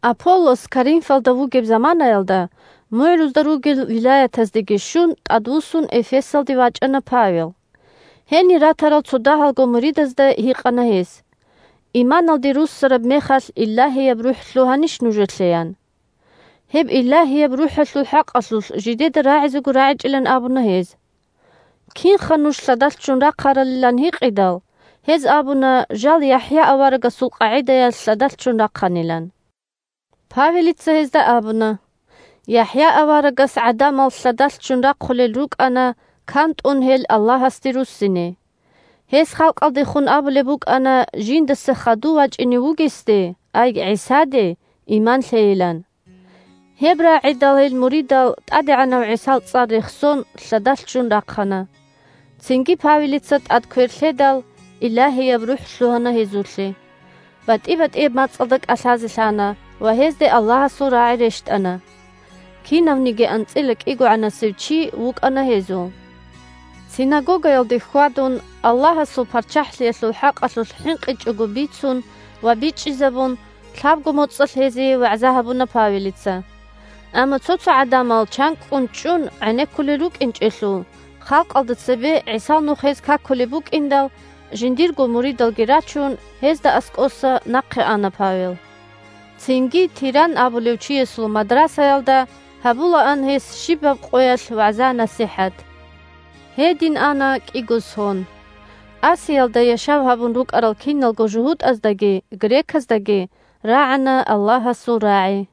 Аполлос Коринфалда вугеб заманаялда, мугӀрузда ругел вилаятаздеги щун, тӀадвуссун Эфесалде вачӀана Павел. Гьенир ратарал цо дагьалго муридазда гьикъана гьес: – Иманалде руссараб мехалъ Илагьияб РухӀ лъугьанищ нужелъе? – ян. Гьеб Илагьияб РухӀалъул хӀакъалъулъ жидеда рагӀизего рагӀичӀилан абуна гьез. Кинха нуж лъадалъ ччун рахъаралилан гьикъидал, гьез абуна жал ЯхӀя аварагасул къагӀидаялъ лъадалъ ччун рахъанилан. Павелица гьезда абуна: – ЯхӀя аварагас гӀадамал лъадалъ ччун рахъулел рукӀана кантӀун гьел Аллагьасде руссине. Гьес халкъалдехун абулеб букӀана жиндаса хадув вачӀине вугесде, ай ГӀисаде, иман лъейилан. Гьеб рагӀидал гьел муридал, ТӀадегӀанав ГӀисал цӀар рехсон, лъадалъ ччун рахъана. Цинги Павелица тӀад квер лъедал, Илагьияб РухӀ лъугьана гьезулъе. БатӀи-батӀияб мацӀалда кӀалъазе лъана ва гьезде Аллагьасул рагӀи рещтӀана. Кинавниги анцӀила кӀигогӀанасев чи вукӀана гьезул. Синагогаялде хьвадун, Аллагьасул ПарччахӀлъиялъул хӀакъалъулъ хӀинкъичӀого бицун ва бичӀчӀизабун, лъабго моцӀалъ гьезие вагӀза гьабуна Павелица. Амма цо-цо гӀадамал чанкӀкӀун чӀун гӀенеккулел рукӀинчӀелъул, халкъалда цебе ГӀисал Нух гьез какулеб букӀиндал, жиндирго муридалги рачун, гьезда аскӀоса нахъе ана Павел. Цинги Тиранн абулев чиясул мадрасаялда гьабулаан гьес щибаб къоялъ вагӀза-насихӀат. Гьедин ана кӀиго сон. Асиялда яшав гьабун рукӀарал киналго жугьутӀаздаги греказдаги рагӀана Аллагьасул рагӀи.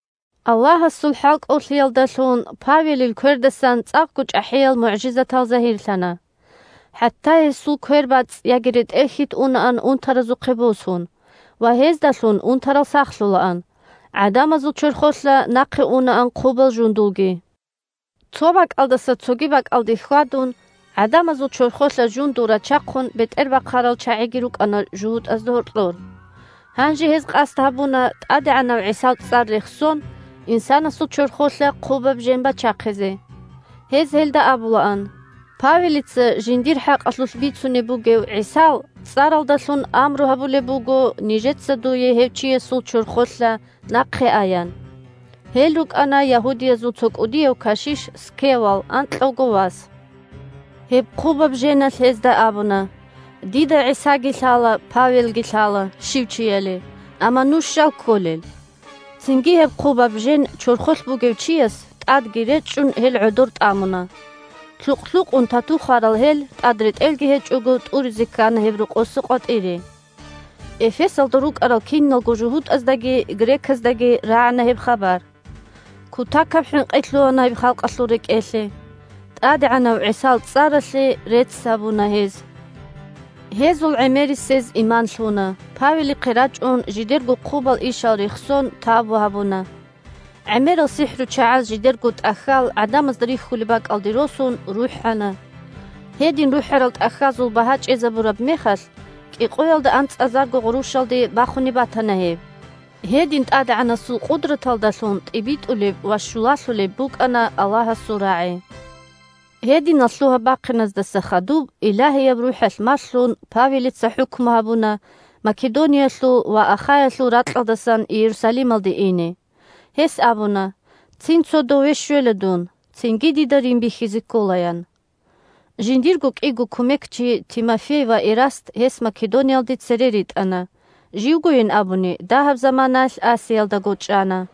Аллагьасул хӀалкӀолъиялдалъун Павелил квердасан цӀакъго чӀахӀиял мугӀжизатал загьирлъана. ХӀатта гьесул квербацӀцӀ яги ретӀел-хьит унаан унтаразухъе босун, ва гьездалъун унтарал сахлъулаан, гӀадамазул чорхолъа нахъе унаан хъубал жундулги. Цо бакӀалдаса цоги бакӀалде хьвадун, гӀадамазул чорхолъа жундул рачахъун бетӀербахъарал чагӀиги рукӀана жугьутӀазда гьоркьор. Гьанже гьез къасд гьабуна ТӀадегӀанав ГӀисал цӀар рехсон инсанасул чорхолъа хъубаб жен бачахъизе. Гьез гьелда абулаан: – Павелица жиндир хӀакъалъулъ бицунеб бугев ГӀисал цӀаралдалъун амру гьабулеб буго нижеца дуе гьев чиясул чорхолъа нахъе аян. (Гьел рукӀана Ягьудиязул цо кӀудияв кашиш Скевал анкьавго вас.) Гьеб хъубаб женалъ гьезда абуна: – Дида ГӀисаги лъала, Павелги лъала щив чияли, амма нуж щал кколел? Цинги гьеб хъубаб жен чорхолъ бугев чияс, тӀадги речӀчӀун, гьел гӀодор тӀамуна. Лъукъ-лъукъун тату хварал гьел, тӀад ретӀелги гьечӀого, тӀуризе ккана гьеб рокъоса къватӀире. Эфесалда рукӀарал киналго жугьутӀаздаги греказдаги рагӀана гьеб хабар. Кутакаб хӀинкъи лъугьана гьеб халкъалъул рекӀелъе. ТӀадегӀанав ГӀисал цӀаралъе рецц гьабуна гьез. Гьезул гӀемерисез иман лъуна, Павелихъе рачӀун, жидерго хъубал ишал рехсон, тавбу гьабуна. ГӀемерал сихӀручагӀаз жидерго тӀахьал, гӀадамазда рихьулеб бакӀалде росун, рухӀана. Гьедин рухӀарал тӀахьазул багьа чӀезабураб мехалъ, кӀикъоялда анцӀазарго гъурущалде бахунеб батана гьеб. Гьедин ТӀадегӀанасул къудраталдалъун тӀибитӀулеб ва щулалъулеб букӀана Аллагьасул рагӀи. Гьединал лъугьа-бахъиназдаса хадуб, Илагьияб РухӀалъ малъун, Павелица хӀукму гьабуна Македониялъул ва Ахаялъул ракьалдасан Иерусалималде ине. Гьес абуна: – Цин цо дове щвела дун, цинги дида Рим бихьизе ккола, – ян. Жиндирго кӀиго кумекчи – Тимофей ва Эраст гьес Македониялде цере ритӀана, живгойин абуни, дагьаб заманаялъ Асиялдаго чӀана.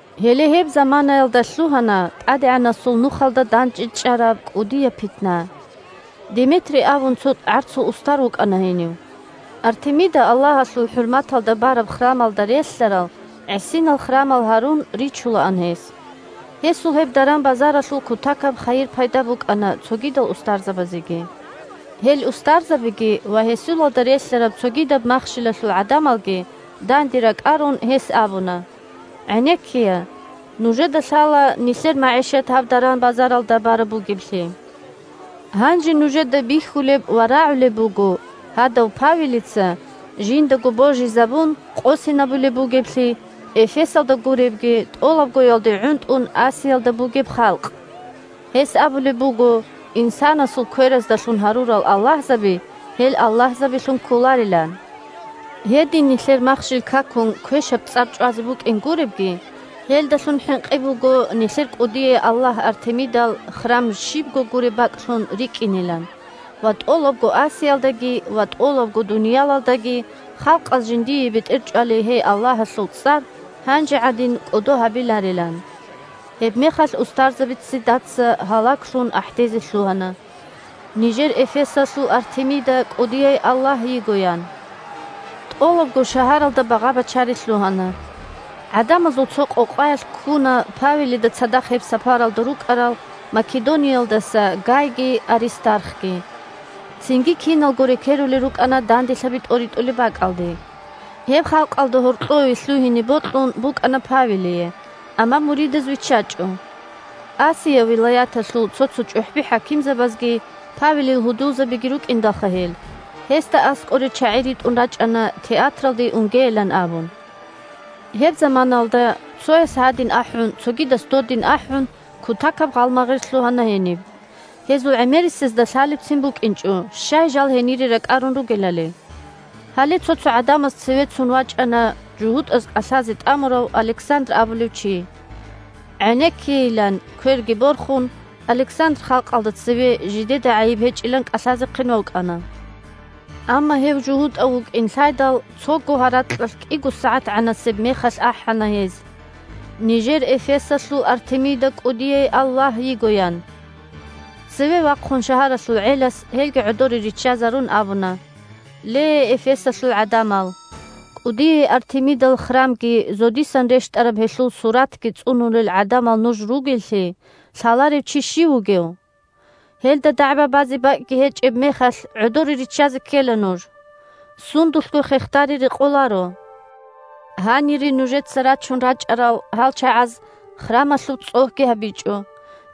Гьеле гьеб заманаялда лъугьана ТӀадегӀанасул Нухалда дандечӀараб кӀудияб питна. Деметрий абун цо гӀарцул устар вукӀана гьенив. Артемида аллагьалъул хӀурматалда бараб храмалда релълъарал гӀисинал храмал гьарун ричулаан гьес. Гьесул гьеб даран-базаралъул кутакаб хайир-пайда букӀана цогидал устарзабазеги. Гьел устарзабиги ва гьесулалда релълъараб цогидаб махщелалъул гӀадамалги данде ракӀарун, гьес абуна: – ГӀенеккея, нужеда лъала нилъер магӀишат гьаб даран-базаралда бараб бугеблъи. Гьанже нужеда бихьулеб ва рагӀулеб буго гьадав Павелица, жиндаго божизабун, къосинабулеб бугеблъи, Эфесалда гуребги, тӀолабгоялде гӀунтӀун Асиялда бугеб халкъ. Гьес абулеб буго, инсанасул квераздалъун гьарурал аллагьзаби – гьел аллагьзабилъун кколарилан. Гьедин нилъер махщел какун квешаб цӀар чӀвазе букӀин гуребги, гьелдалъун хӀинкъи буго нилъер кӀудияй аллагь Артемидал храм щибго гуреб бакӀлъун рикӀкӀинилан ва тӀолабго Асиялдаги ва тӀолабго дуниялалдаги халкъаз жиндие бетӀерчӀвалей гьей аллагьалъул цӀар гьанже гӀадин кӀодо гьабиларилан. Гьебмехалъ устарзаби ццидаца гьалаглъун ахӀдезе лъугьана: – Нижер Эфесалъул Артемида кӀудияй аллагь йиго! – ян. ТӀолабго шагьаралда багъа-бачари лъугьана. ГӀадамазул цо къокъаялъ ккуна Павелида цадахъ гьеб сапаралда рукӀарал Македониялдаса Гайги Аристархги. Цинги киналго рекерулел рукӀана данделъаби тӀоритӀулеб бакӀалде. Гьеб халкъалда гьоркьове лъугьине бокьун букӀана Павелие, амма муридаз виччачӀо. Асия вилаяталъул цо-цо чӀухӀби-хӀакимзабазги, – Павелил гьудулзабиги рукӀиндалха гьел, – гьесда аскӀоре чагӀи ритӀун рачӀана театралде унгейилан абун. Гьеб заманаялда цояс гьадин ахӀун, цогидас додин ахӀун, кутакаб гъалмагъир лъугьана гьениб. Гьезул гӀемерисезда лъалебцин букӀинчӀо щай жал гьенире ракӀарун ругелали. Гьале цо-цо гӀадамаз цеве цун вачӀана жугьутӀаз кӀалъазе тӀамурав Александр абулев чи. ГӀенеккейилан, кверги борхун, Александр халкъалда цеве жидеда гӀайиб гьечӀилан кӀалъазехъин вукӀана. Амма гьев жугьутӀав вукӀин лъайдал, цого гьаракьалъ кӀиго сагӀатгӀанасеб мехалъ ахӀана гьез: – Нижер Эфесалъул Артемида кӀудияй аллагь йиго! – ян. Цеве вахъун, шагьаралъул гӀелас, гьелги гӀодоре риччазарун, абуна: – Ле, Эфесалъул гӀадамал! КӀудияй Артемидал храмги зодисан рещтӀараб гьелъул суратги цӀунулел гӀадамал нуж ругеллъи лъаларев чи щив вугев? Гьелда дагӀба базе бакӀги гьечӀеб мехалъ, гӀодоре риччазе ккела нуж. Сундулъго хехдари рекъоларо. Гьанире нужеца рачун рачӀарал гьал чагӀаз храмалъуб цӀогьги гьабичӀо,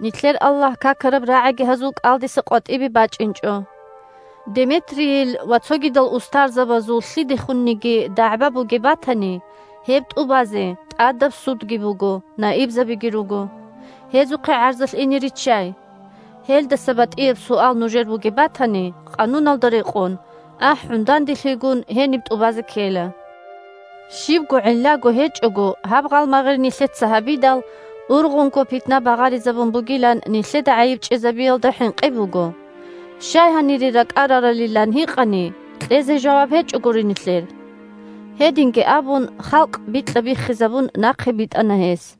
нилъер аллагь какараб рагӀиги гьазул кӀалдиса къватӀибе бачӀинчӀо. Деметрийил ва цогидал устарзабазул лъидехунниги дагӀба бугеб батани, гьеб тӀубазе тӀадаб судги буго, наибзабиги руго. Гьезухъе гӀарзалъ ине риччай. Гьелдаса батӀияб суал нужер бугеб батани, къануналда рекъон, ахӀун данделъигун, гьениб тӀубазе ккела. Щибго гӀиллаго гьечӀого гьаб гъалмагъир нилъеца гьабидал, ургъунго питна багъаризабун бугилан, нилъеда гӀайиб чӀезабиялда хӀинкъи буго. Щай гьанире ракӀараралилан гьикъани, кьезе жаваб гьечӀогури нилъер. Гьединги абун, халкъ бикьа-биххизабун нахъе битӀана гьес.